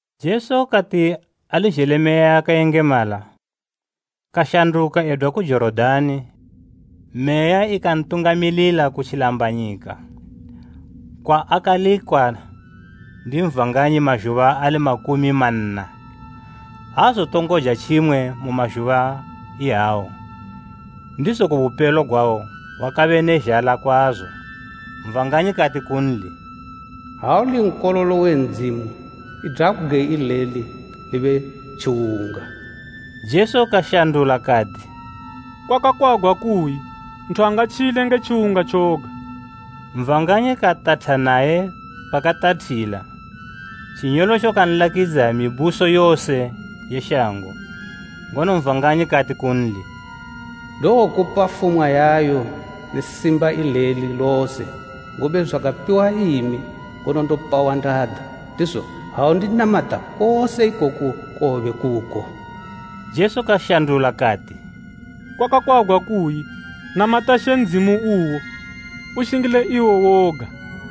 Jesu kati ali zhele Meya yakayengemala, kashanduka edwa ku Jorodani Meya ikantungamilila ku tjilambanyika, kwaakalikwa ndi Satani mazhuba ali makumi manna. Aazotongoja tjimwe mu mazhuba iyawo, ndizo kubupelo gwawo wakabe ne zhala kwazo. Satani kati kunli, “Ha uli Nkololo we Ndzimu, idwa bgwe ileli libe tjiwunga!” Jesu kashandula kati, “Kwakakwagwa kuyi, ‘Nthu aatotjila nge tjiwunga tjoga.’” Satani katatha naye pakatathila, tjinyolotjo kanlakidza mituthu yose shango. Ngono Satani kati kunli “Ndowokupa fumwa yayo ne simba eleli lose, ngobe zwakapiwa imi, ngono ndopa wandada. Ndizo ha undinamata kose ikoku kowobe kuko.” Jesu kashandula kati, “Kwakakwagwa kuyi, ‘Namata She Ndzimu uwo, ushingile iwo woga.’”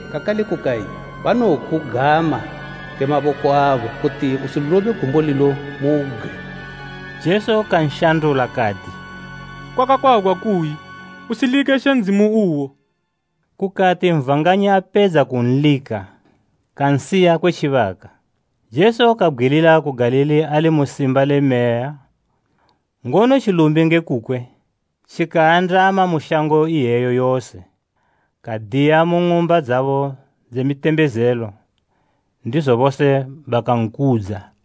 Kakale kukayi, ‘Banowokugama nge maboko abo, kuti usilobe gumbo lilo mu bgwe.’” Jesu kanshandula kati, “Kwakakwagwa kuyi, ‘Usilike She Ndzimu uwo.’” Kukati Satani apedza kunlika, kansiya kwe tjibaka. Jesu kabgwilila ku Galili ali mu simba le Meya, ngono tjilumbi nge kukwe tjikaandama mu shango iyeyo yose. Kadiya mu ng'umba dzabo dze mitembezelo, ndizo bose bakankudza.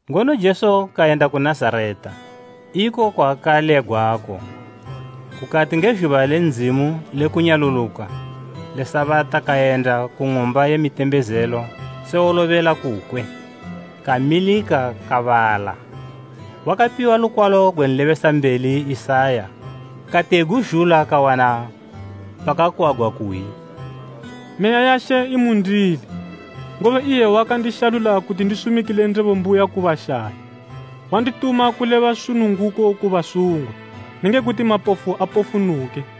Ngono Jesu kayenda ku Nazareta, iko kwaakalegwako, kukati nge zhuba le Ndzimu lekunyaluluka le Sabata kayenda ku ng'umba ye mitembezelo se wolobela kukwe. Kamilika kubala. Wakapiwa lukwalo gwe nlebesambeli Isaya. Kati eguzhula kawana pakakwagwa kuyi, “Meya ya She imundili, ngobe iye wakandishalula kuti ndisumikile ndebo mbuya ku bashayi. Wandituma kuleba sununguko ku basungwa, nenge kuti mapofu apofunuke,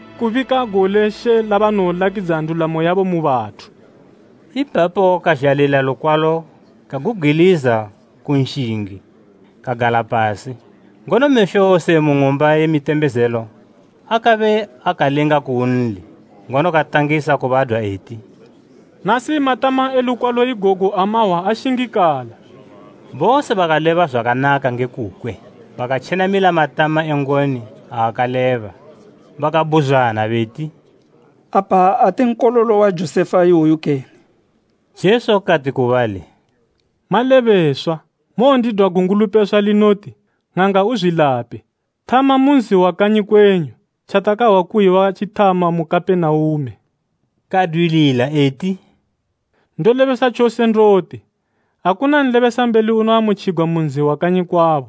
kubika gole She labanowolakidza ndulamo yabo mu bathu.” Ipapo kazhalila lukwalo kagubgwiliza ku nshingi, kagala pasi. Ngono mesho wose mu ng'umba ye mitembezelo akabe akalinga kunli, ngono katangisa kubadwa eti, “Nasi matama e lukwalo igogu amahwa ashingikala.” Bose bakaleba zwakanaka nge kukwe, bakatjenamila matama e ngoni aakaleba. Bakabhuzwana beti, “Apa ate nkololo wa Josefa iwoyu kene?” Jesu kati ku bali, “Malebeswa mowondidwa gungulupeswa linoti, ‘Ng'anga, uzwilape.’ Thama mu nzi wa kanyi kwenyu, tjatakahwa kuyi watjithama mu Kapenaume.” Kadwilila eti, “Ndolebesa tjose ndoti, akuna nlebesambeli unoamutjigwa mu nzi wa kanyi kwabo.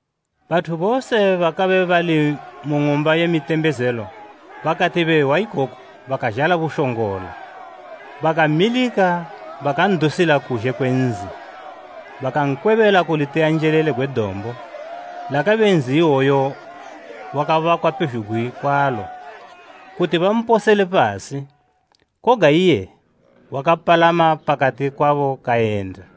Bathu bose bakabe bali mu ng'umba ye mitembezelo bakati behwa ikoku bakazhala bushongola. Bakamilika bakan'dusila kuzhe kwe nzi, bakankwebela kuliteyanjelele gwe dombo, lakabe nzi iwoyo wakabakwa pezhugwi kwalo, kuti bamposele pasi. Koga iye wakapalama pakati kwabo kayenda.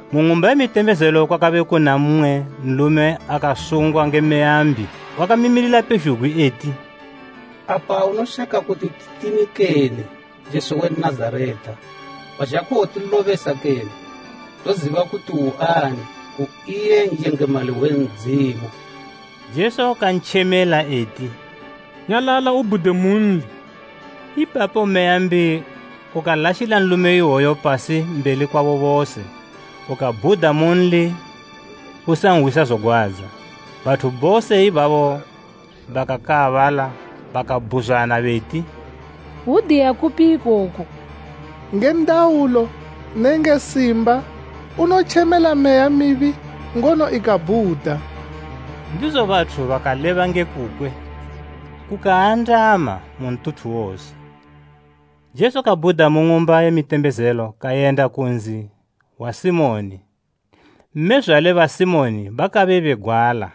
Mu ng'umba ye mitembezelo kwakabe kuna mmwe nlume akasungwa nge meya mbi. Wakamimilila pezhugwi eti, “Apa unoshaka kuti titini kene, Jesu we Nazareta? Wazha kuwotilobesa kene? Ndoziba kuti uani. U iye N'yengemali we Ndzimu.” Jesu kantjemela eti, “Nyalala ubhude munli!” Ipapo meya mbi ukalashila nlume iwoyo pasi mbeli kwabo bose, ukabhuda munli usanhwisa zogwadza. Bathu bose ibabo bakakaabala bakabhuzwana beti, “Hwudiya kupi ikoku! Nge ndaulo nenge simba unotjemela meya mibi ngono ikabhuda!” Ndizo bathu bakaleba nge kukwe kukaandama mu ntuthu wose. Jesu kabhuda mu ng'umba ye mitembezelo kayenda ku nzi wa Simoni. Mmezwale ba Simoni bakabe begwala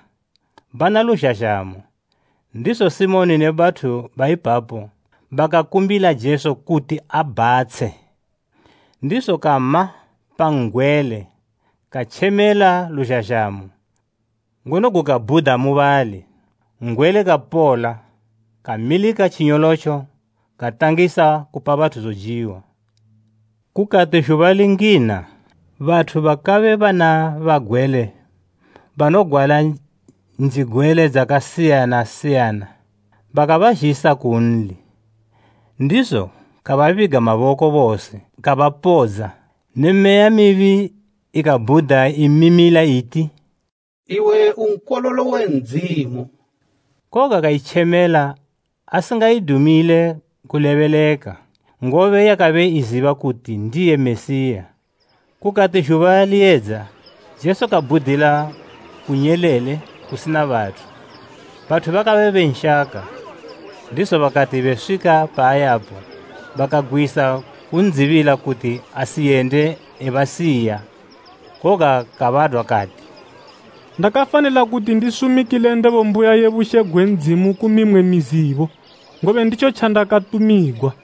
bana luzhazhamo, ndizo Simoni ne bathu baipapo bakakumbila Jesu kuti abhatshe. Ndizo kama pa n'gwele katjemela luzhazhamo, ngono gukabhuda mubali. N'gwele kapola, kamilika tjinyolotjo katangisa kupa bathu zojiwa. Kukati zhuba lingina, bathu bakabe bana bagwele banogwala njigwele dzakasiyana siyana, bakabazhisa kunli, ndizo kababiga maboko bose, kabapodza. Ne meya mibi ikabhuda imimila iti, “Iwe u Nkololo we Ndzimu!” Koga kaitjemela asingaidumile kulebeleka, ngobe yakabe iziba kuti ndiye Mesiya. Kukati zhuba liyedza, Jesu kabhudila ku nyelele kusina bathu. Bathu bakabe benshaka, ndizo bakati beswika paayapo bakagwisa kun'dzibila kuti asiyende ebasiya. Koga kabadwa kati, “Ndakafanila kuti ndisumikile ndebo mbuya ye bushe gwe Ndzimu ku mimwe mizibo, ngobe nditjo tjandakatumigwa.”